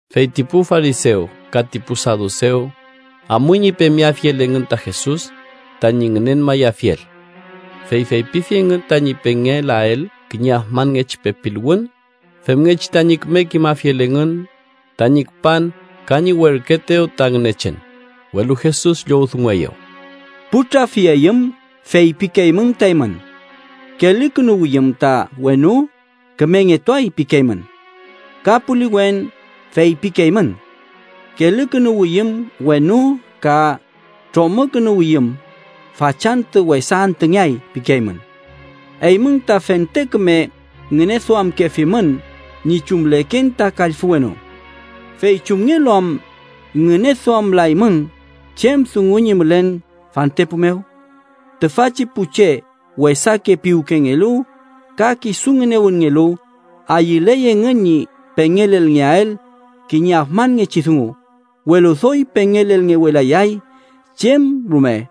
Fey ti pu farisew ka ti pu sadusew amuy ñi pemeafiel engün ta Jesus tañi ngünenmayafiel. Fey feypifi engün tañi pengelael kiñe afmanngechi pepiluwün femngechi tañi küme kimafiel engün tañi küpan ka ñi werküetew ta Ngünechen. Welu Jesus llowdungueyew: “Pu trafiayüm feypikeymün ta eymün: ‘Kelükünuwiyüm ta wenu, kümengetuay’ pikeymün. Ka puliwen feypikeymün: ‘Kelükünuwiyüm wenu ka tromükünuwiyüm, fachantü wesa antüngeay’ pikeymün. Eymün ta fente küme ngüneduamkefimün ñi chumleken ta kallfü wenu. ¿Fey chumngelu am ngüneduamlaymün chem dungu ñi mülen fantepu mew? Tüfachi pu che wesake piwkengelu ka kisu ngünewünngelu ayüley engün ñi pengelelngeael kiñe afmanngechi dungu, welu doy pengelelngewelayay chem rume,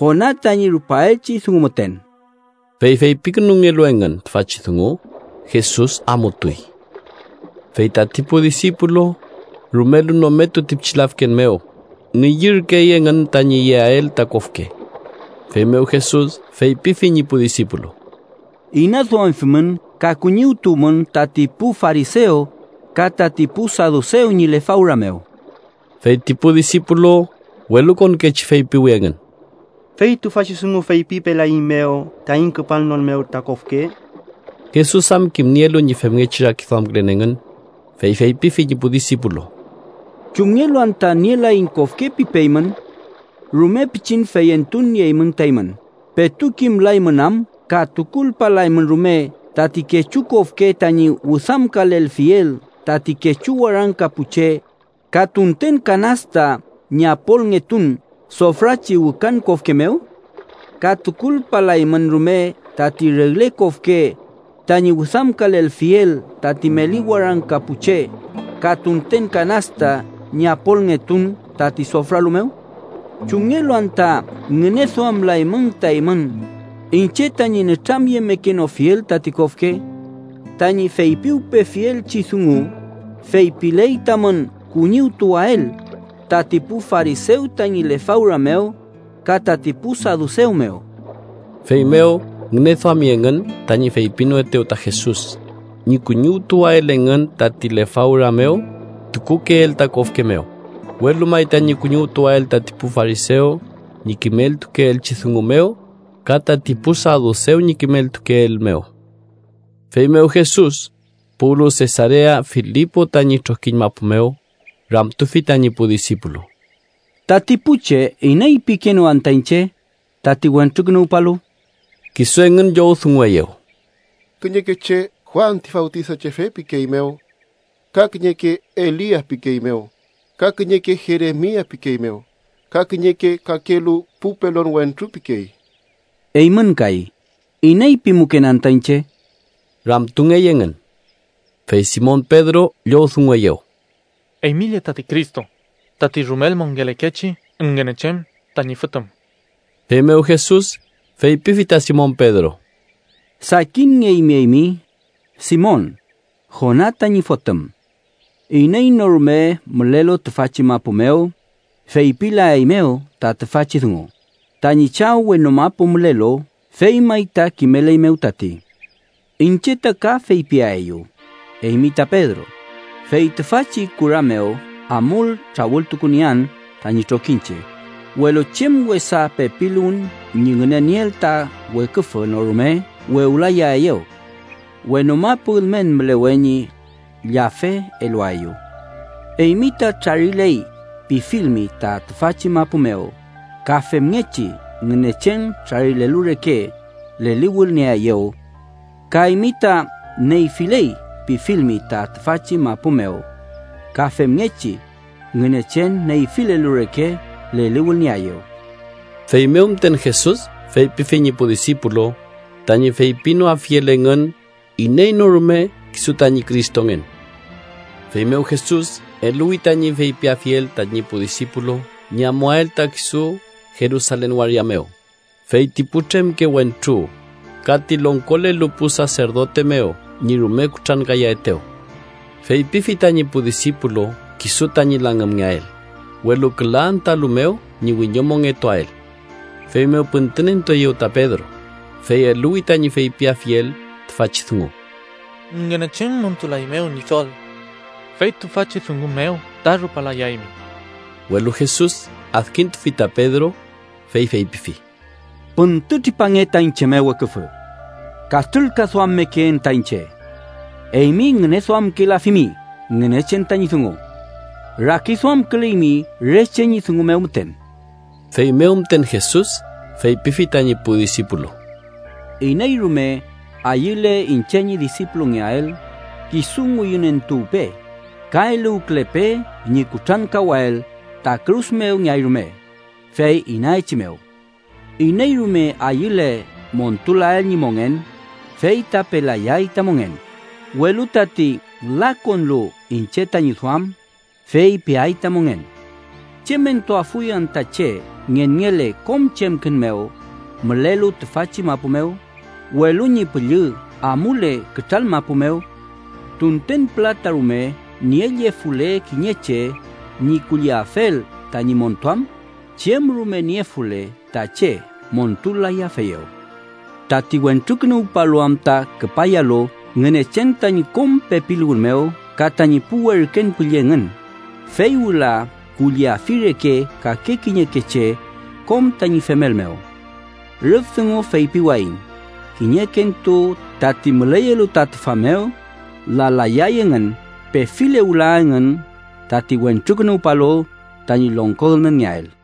Jona tañi rupaelchi dungu müten.” Fey feypikünungelu engün tüfachi dungu, Jesus amutuy. Fey tati pu disipulu rumelu nometu ti pichi lafken mew, ngüyürkey engün tañi yeael ta kofke. Feymew Jesus feypifi ñi pu disipulu: —Inaduamfimün ka kuñiwtuwmün tati pu farisew ka tati pu sadusew ñi lefawra mew. Fey ti pu disipulu welukonkechi feypiwi engün: —¿Fey tüfachi dungu feypipelaeiñmew taiñ küpalnon mew ta kofke? Jesus am kimnielu ñi femngechi rakiduamkülen engün, fey feypifi ñi pu disipulu: —¿Chumngelu anta ‘nielaiñ kofke’ pipeymün? ¡Rume pichin feyentun nieymün ta eymün! ¿Petu kimlaymün am ka tukulpalaymün rume tati kechu kofke tañi wüdamkalelfiel tati kechu warangka pu che ka tunten kanasta ñi apolngetun sofrachi wükan kofke mew? ¿Ka tukulpalaymün rume tati regle kofke tañi wüdamkalelfiel tati meli warangka pu che ka tunten kanasta ñi apolngetun tati sofralu mew? ¿Chumngelu anta ngüneduamlaymün ta eymün iñche tañi nütramyemekenofiel tati kofke? Tañi feypiwpefielchi dungu feypiley tamün kuñiwtuwael tati pu farisew tañi lefawra mew ka tati pu sadusew mew. Feymew ngüneduami engün tañi feypinoetew ta Jesus ñi kuñiwtuwael engün tati lefawra mew tukukeel ta kofke mew, welu may tañi kuñiwtuwael tati pu farisew ñi kimeltukeelchi dungu mew ka tati pu sadusew ñi kimeltukeel mew. Feymew Jesus puwlu Sesarea Filipo tañi trokiñ mapu mew, ramtufi tañi pu disipulu: —Tati pu che, ¿iney pikeenew anta iñche, tati Wentrukünuwpalu? Kisu engün llowdungueyew: —Kiñeke che Juan ti Fawtisachefe pikeeymew. Ka kiñeke Elia pikeeymew, ka kiñeke Jeremia pikeeymew ka kiñeke kakelu pu pelon wentru pikey. —Eymün kay, ¿iney pimuken anta iñche? ―ramtungey engün. Fey Simon Pedro llowdungueyew: —Eymi lle tati Cristo, tati rumel mongelekechi Ngünechen tañi Fotüm. Feymew Jesus feypifi ta Simon Pedro: —Sakinngeymi eymi, Simon, Jona tañi fotüm. Iney no rume mülelu tüfachi mapu mew feypilaeymew ta tüfachi dungu, tañi Chaw wenu mapu mülelu fey may ta kimeleymew tati. Iñche ta ka feypiaeyu, eymi ta Pedro, fey tüfachi kura mew amul trawültukuniean tañi trokiñche, welu chem wesa pepiluwün ñi ngünenieel ta weküfü no rume wewlayaeyew. Wenu mapu ülmen mülewe ñi llafe eluaeyu. Eymi ta ‘trariley’ pifilmi ta tüfachi mapu mew, ka femngechi Ngünechen trarilelu reke leliwülnieaeyew. Ka eymi ta ‘neyfiley’ pifilmi ta tüfachi mapu mew, ka femngechi Ngünechen neyfilelu reke leliwülnieaeyew. Feymew müten Jesus feypifi ñi pu disipulu tañi feypinoafiel engün iney no rume kisu tañi Cristongen. Feymew Jesus eluwi tañi feypiafiel tañi pu disipulu ñi amuael ta kisu Jerusalen waria mew, fey ti putremke wentru ka ti longkolelu pu saserdote mew ñi rume kutrankayaetew. Feypifi tañi pu disipulu kisu tañi langümngeael, welu küla antüalu mew ñi wiñomongetuael. Feymew püntünentueyew ta Pedro, fey eluwi tañi feypiafiel tüfachi dungu: —¡Ngünechen montulaeymew, Ñidol! ¡Fey tüfachi dungu mew ta rupalayaymi! Welu Jesus adkintufi ta Pedro, fey feypifi: —¡Püntütripange ta iñche mew, weküfü! ¡Katrülkaduammekeen ta iñche! Eymi ngüneduamkelafimi Ngünechen tañi dungu. Rakiduamküleymi re che ñi dungu mew müten. Feymew müten Jesus feypifi tañi pu disipulu: —Iney rume ayüle iñche ñi disipulungeael, kisu ngüyünentuwpe, ka eluwkülepe ñi kutrankawael ta kürus mew ngeay rume, fey inaechimew. Iney rume ayüle montulael ñi mongen, fey ta pelayay ta mongen, welu tati lakonlu iñche tañi duam, fey peay ta mongen. ¿Chem entuafuy anta che ngenngele kom chemkün mew mülelu tüfachi mapu mew, welu ñi püllü amule kütral mapu mew? Tunten pülata rume niellefule kiñe che ñi kulliafel tañi montuam, chem rume niefule ta che montul-layafeyew. Tati Wentrukünuwpalu am ta küpayalu Ngünechen tañi kom pepiluwün mew ka tañi pu werken püllü engün, fey wüla kulliafi reke kake kiñeke che kom tañi femel mew. Rüf dungu feypiwayiñ kiñekentu tati müleyelu ta tüfa mew lalayay engün pefile wüla engün tati Wentrukünuwpalu tañi longko ülmenngeael.